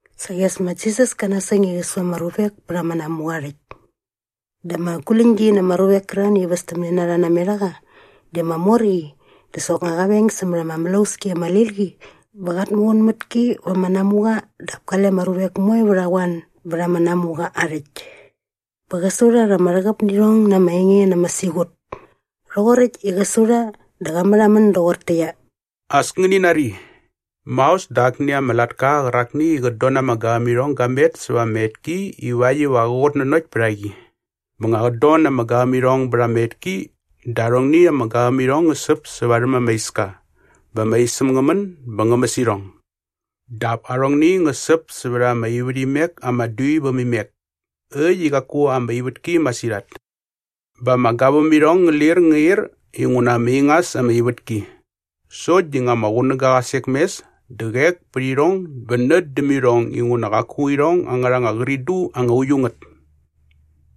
Saqi as ma Jisas kä nasäng i qä su ama ruvek pät ama namuqa aa rhäkt. Dä ama guläñgi na ama ruvek kärarhani i västämne na rha namet a qa di ama mor qi dä soknga qa veng sämät ama mlauski ama lil qi bä qat muqun mät ki va ama namuqa dap kale ama ruvek moe vät a qoan bät ama namuqa aa rhäkt. Bä qä su rha rha ama rhäqäp nä irhong na ama enge na ama siqut. Rhoqoräkt i qä su dä qa märhamän doqortäqyia, “As ngäni nari! Maos dä akni ama latka qärakni i qät don na ama gavämirhong ga met säva ama etki ivakt iva qä qutnanokt pät a qi. Bä nga qät don na ama gavämirhong bät ama etki dä arhongni ama gavämirhong ngä säp sä varhäm ama iska bä ama isäm ngä män bä ngä mäs irhong. Dap arhongni ngä säp sävät ama ivärhimek ama dui väm imek äkt i qaku ama ivätki masirhat. Bä ama gavämirhong ngä lir ngä ir inguna ama ingas ama ivätki. Sokt di nga ama qunäga qa sek mes dä qek pät irhong bä nät däm irhong inguna qaku irhong angärha anga qridu anga uiu ngät.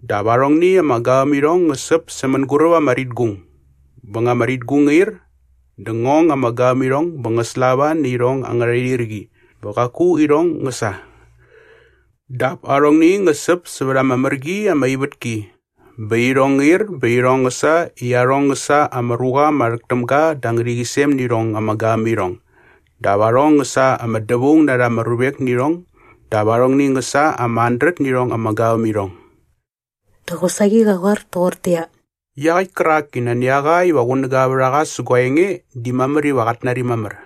Dap arhongni ama gavämirhong ngä säp sä mänguräp ama ritgung bä nga ama ritgung ngä ir dä ngä ong ama gavämirhong bä ngä slava nä irhong angärha irhirqi bä qaku irhong ngä sa. Dap arhongni ngä säp sävät ama mär qi ama ivätki bä irhong ngä ir bä irhong ngä sa i arhong ngä sa ama ruqa ama rhäk täm ga da ama ngärhäqyisem nä irhong ama gavämirhong dap arhong ngä sa ama dävaung na rha ama ruvek nä irhong dap arhong ngä sa ama handret nä irhong ama gavämirhong.” Dä qosaqi qa qoar toqortäqyia, “Iaqäkt kärak i nani a qa iva qunäga vät a qa sä gua enge di mamär iva qat nari mamär.”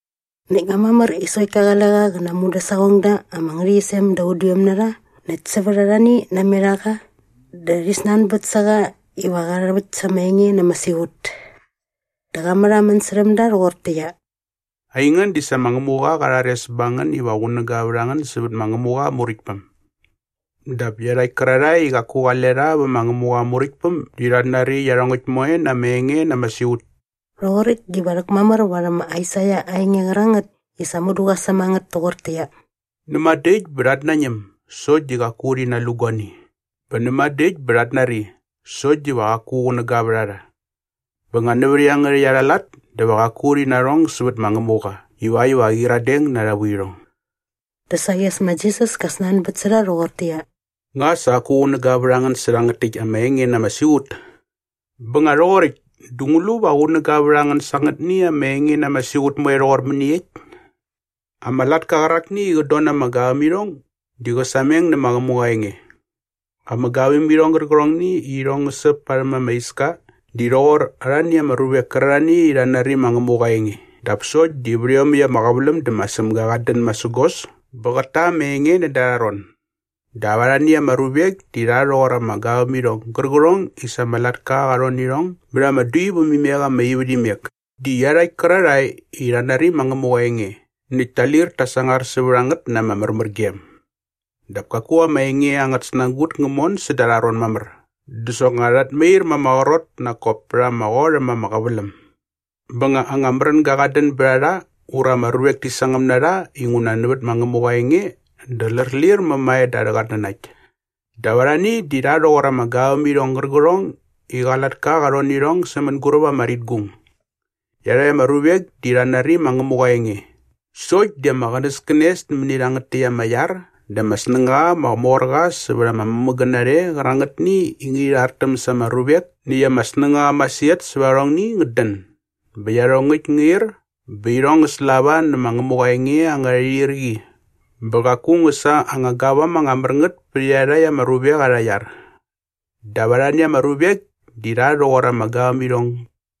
Näkt nga mamär i sokt ka qale qa qä na aa mudäsaqongda ama ngärhäqyisem da udiom na rha näkt sävät arhani namet a qa dä rhi snanbät sä qa iva qä rhäväkt sa aa enge na ama siqut. Dä qa märhamän särhäm da rhoqortäqyia, “Aingän di sa ma Ngämuqa qa rhares ba ngän iva qunäga vät a ngän sävät ma Ngämuqa aa Muräktpäm. Dap iarhakt kärarhae i qaku qale rha vä ma Ngämuqa aa Muräktpäm di rhat nari iarhongäkt moe na ama enge na ama siqut.” Rhoqoräkt diva rhäkmamär varhäm ma Aisaia aa enge qärangät i sa mudu qa säm a ngät toqortäqyia, “‘Näma dä äkt bä rhat nañäm sokt diva qaku rhi nalu guani bä näma dä äkt bä rhat nari sokt diva qaku qunäga vät a rha. Bä nga nävät iangärhäkt arha lat dä va qaku rhi narhong sävät ma Ngämuqa ivakt iva qä qyiradeng na arha vuirhong!’” Dä saqi as ma Jisas ka snanbät sä rha rhoqortäqyia, “Nga sa qaku qunäga vät a ngän sä rhangät täkt ama enge na ama siqut? Bä nga rhoqoräkt dä ngu lu va qunäga vät a ngän sa angätni ama enge na ama siqut moe rhoqor mäniekt? Ama latka qärakni i qät don na ama gavämirhong di qä sameng nä ma Ngämuqa aa enge. Ama gavämirhong gärqärhongni i irhong ngä säp parhäm ama iska di rhoqor arhani ama ruvek kärarhani i rha nari ma Ngämuqa aa enge dap sokt di vät iomäkt ama qäväläm dä ma Sämga qat dän masägos bä qät ta ama enge näda arha rhon. Dap arhani ama ruvek di rha rhoqor ama gavämirhong gärqärhong i sa ama latka qa rhon nä irhong bät ama dui vät imek ama ivärhimek di iarhakt kärarhae i rha nari ma Ngämuqa aa enge näkt ta lir ta sangar sävät a ngät na ama märmärgem. Dap kaku ama enge angät snagut ngä mon säda arha ron mamär dä soknga rhat mair ma ama qrot nak kop pät ama qot äm ama qäväläm. Bä nga anga märänga qat dän bät a rha ura ama ruvek ti sangäm na rha inguna nävät ma Ngämuqa aa enge dä lärlir mämae da arhä qatnanakt. “Dap arhani di rha rhoqor ama gavämirhong gärqärhong i qa latka qa rhon nä irhong sä mänguräp ama ritgung. Iarhakt ama ruvek di rha nari ma Ngämuqa aa enge sokt di ama qänäskänes nämäni rhangät täkt ama iar dä ama snängaqa ama mor qa sävät ama mämägän narhe qärangätni i ngärhi irastäm sa ama ruvek näkt ama snängaqa masirhat sävät arhongni ngät dän bä iarhongäkt ngä ir bä irhong ngä slava nä ma Ngämuqa aa enge angärha irhirqi bä qaku ngä sa anga gavam anga mär ngät pät iarhakt ama ruvek arha iar. Dap arhani ama ruvek di rha rhoqor ama gavämirhong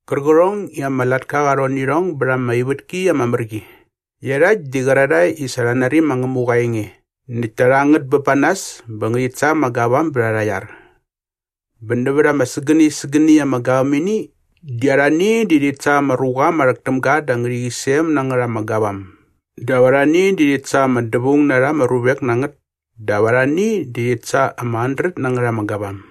gärqärhong i ama latka qa rhon nä irhong bät ama ivätki ama mär qi. Iarhakt di qärarhae i sa rha nari ma Ngämuqa aa enge näkt ta rha ngät bä ba nas bä ngärhit sa ama gavam bät arha iar. Bä nävät ama sägäni sägäni ama gavämini di arhani di rhit sa ama ruqa ama rhäk täm ga da ama ngärhäqyisem na ngät ama gavam dap arhani di rhit sa ama dävaung na rha ama ruvek na ngät dap arhani di rhit sa ama handret na ngät ama gavam.”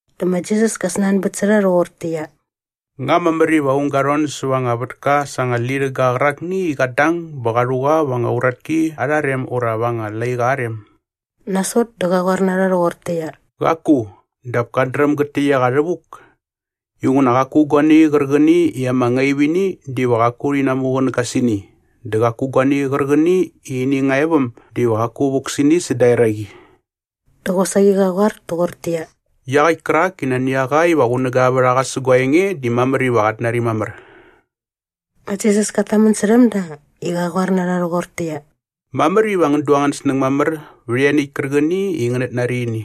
Dä ma Jisas ka snanbät sä rha rhoqortäqyia, “Nga mamär iva aung ga rhon säva anga vätka sa anga lirhäga qärakni i qat dang bä qa rhu qa va anga uratki arha rem ura va anga laiqa aa rem?” Nasot dä qa qoar na rha rhoqortäqyia, “Qaku, dap kat dräm gat täkt a qa rhävuk. Inguna qaku guani qärqäni i ama ngaip ini diva qaku rhi namuqunäga sä ini dä qaku guani qärqäni i ini nga e väm diva qaku vuk sä ini säda eraqi.” Dä qosaqi qa qoar toqortäqyia, “Iaqäkt kärak i nani a qa iva qunäga vät a qa sä gua enge di mamär iva qat nari mamär.” Ma Jisas kat tamän särhäm da i qa qoar na rha rhoqortäqyia, “Mamär iva ngän du angän snäng mamär vät ianiäkt kärqäni i ngänät nari ini”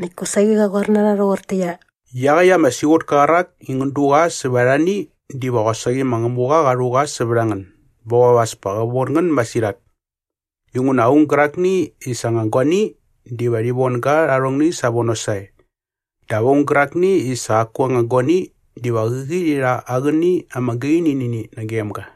näkt kosaqi qa qoar na rha rhoqortäqyia, “Iaqäkt ama siqutka qärak i ngän du qa sävät arhani diva qosaqi ma Ngämuqa qa rhu qa sävät a ngän bä qop as pa qä von ngän masirhat. Inguna aung gärakni i sa aa anga guani diva rhi von ga rha arhongni savono sae. Dap aung gärakni i sa qaku aa anga guani diva qäqi rhi rha aa qäni ama gaini nä ini nagem ga.”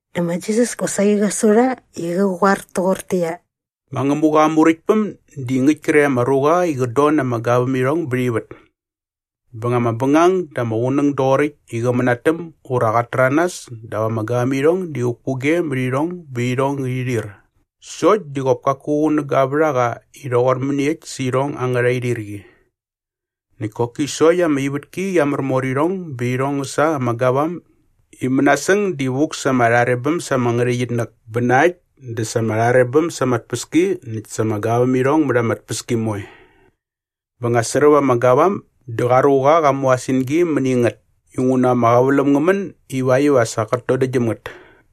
Dä ma Jisas kosaqi qä su rha i qä qoar toqortäqyia, “Ma Ngämuqa aa Muräktpäm di ngäkt kre ama ruqa i qät don na ama gavämirhong bät ivät. Bä nga ama bängang dä ama qunäng doqoräkt i qä mänatäm ura qat täranas dap ama gavämirhong di vukpukge mät irhong bä irhong ngärhi rhir sokt di qop kaku qunäga vät a qa i rhoqor mäniekt sä irhong angärha irhirqi. Näkt koki sokt ama ivätki qia märmor irhong bä irhong ngä sa ama gavam i mänasäng di vuk sa ama rharebäm sa ama ngärhäqyitnäk bä na äkt dä sa ama rharebäm sa ama tpäski näkt sa ama gavämirhong mät ama tpäski moe. Bä nga sräp ama gavam dä qa ruqa qa mu aa singi mäni ngät inguna ama qäväläm ngä män ivakt iva sa qät dodäktgyäm ngät.”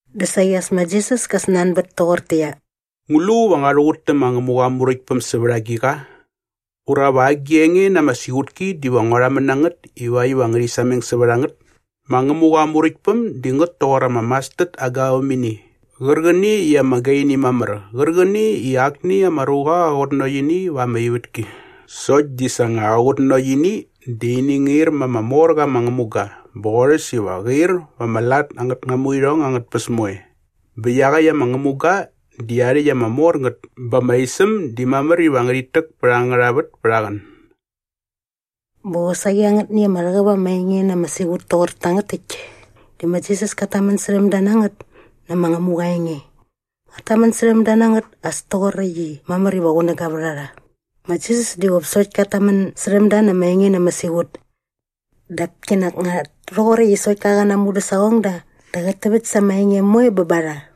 Dä saqi as ma Jisas ka snanbät toqortäqyia, “Ngu lu va ngua rhuqut tä ma Ngämuqa aa Muräktpäm sävät agiqa? Ura va agi enge na ama siqutki diva ngua rhamän na ngät ivakt iva ngärhi sameng sävät a ngät? Ma Ngämuqa aa Muräktpäm di ngät toqor ama mastard aa gavämini qärqäni i ama gaini mamär qärqäni i akni ama ruqa qa qutnanokt ini va ama ivätki. Sokt di sa nga qa qutnanokt ini dä ini ngä ir ma ama mor qa ama ngämuga bä qorhäs iva qä ir va ama lat angät namuirhong angät tpäs moe bä iaqäkt ama ngämuga di aa rhäkt ama mor ngät bä ama isäm di mamär iva ngärhit täk pät angärha vät pät aa qän.” Bä qosaqi angätni ama rhäqäp ama enge na ama siqut toqor tangät täkt di ma Jisas kat tamän särhäm da na ngät nä ma Ngämuqa aa enge. Qat tamän särhäm da na ngät as toqoräkt i mamär iva qunäga vät a rha. Ma Jisas di qop sokt kat tamän särhäm da na ama enge na ama siqut. Dap kinak nga rhoqoräkt i sokt ka qä na aa mudäsaqongda dä qät täväkt sa ama enge moe bä ba rha.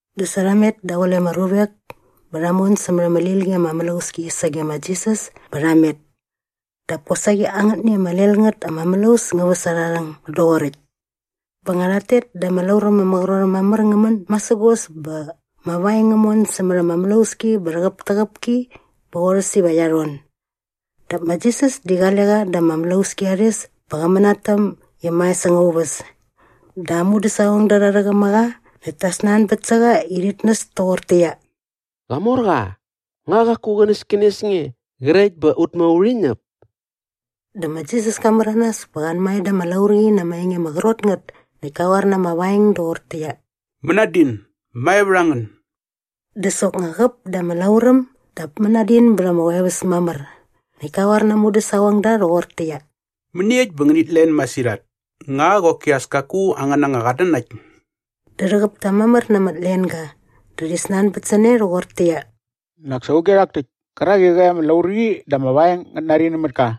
Dä sa rha met daqule ama ruvek bä rha mon sämät ama lil qi ama mlauski sage ma Jisas bä rha met. Dap kosaqi angätni ama lel ngät ama mlaus ngä väs aa rhäng doqoräkt. Bä nga rhat tet dä ama lauräm ama qrot äm mamär ngä män masägos bä ama vaeng ngä mon sämät ama mlauski bä rhäqäptäqäp ki bä qorhäs iva qia rhon. Dap ma Jisas di qale qa da ama mlauski at es bä qä mänatäm i mae säng aa uväs. Dä aa mudäsaqongda rha rhäqäm a qa näkt ta snanbät sä qa i rhit näs toqortäqyia, “Qamorqa, nga qaku qänäskänes nge qrekt bä ut moe urhi ñäp?” Dä ma Jisas ka märanas bä qa anmae da ama laurqi na ama enge ama qrot ngät näkt ka qoar na ama vaeng doqortäqyia, “Mänadin! Mae vät a ngän!” Dä soknga qäp da ama lauräm dap mänadin bät ama qoeväs mamär. Näkt ka qoar na aa mudäsaqongda rhoqortäqyia, “Mäniekt bä ngänit len masirhat? Nga qoki as kaku angän anga qatnanakt?” Dä rhäqäp ta mamär na ama tlenga dä rhi snanbät sä ne rhoqortäqyia, “Nak sa auge rhak täkt kärak i qäqi ama laurqi dä ama vaeng ngät nari nämät ka?”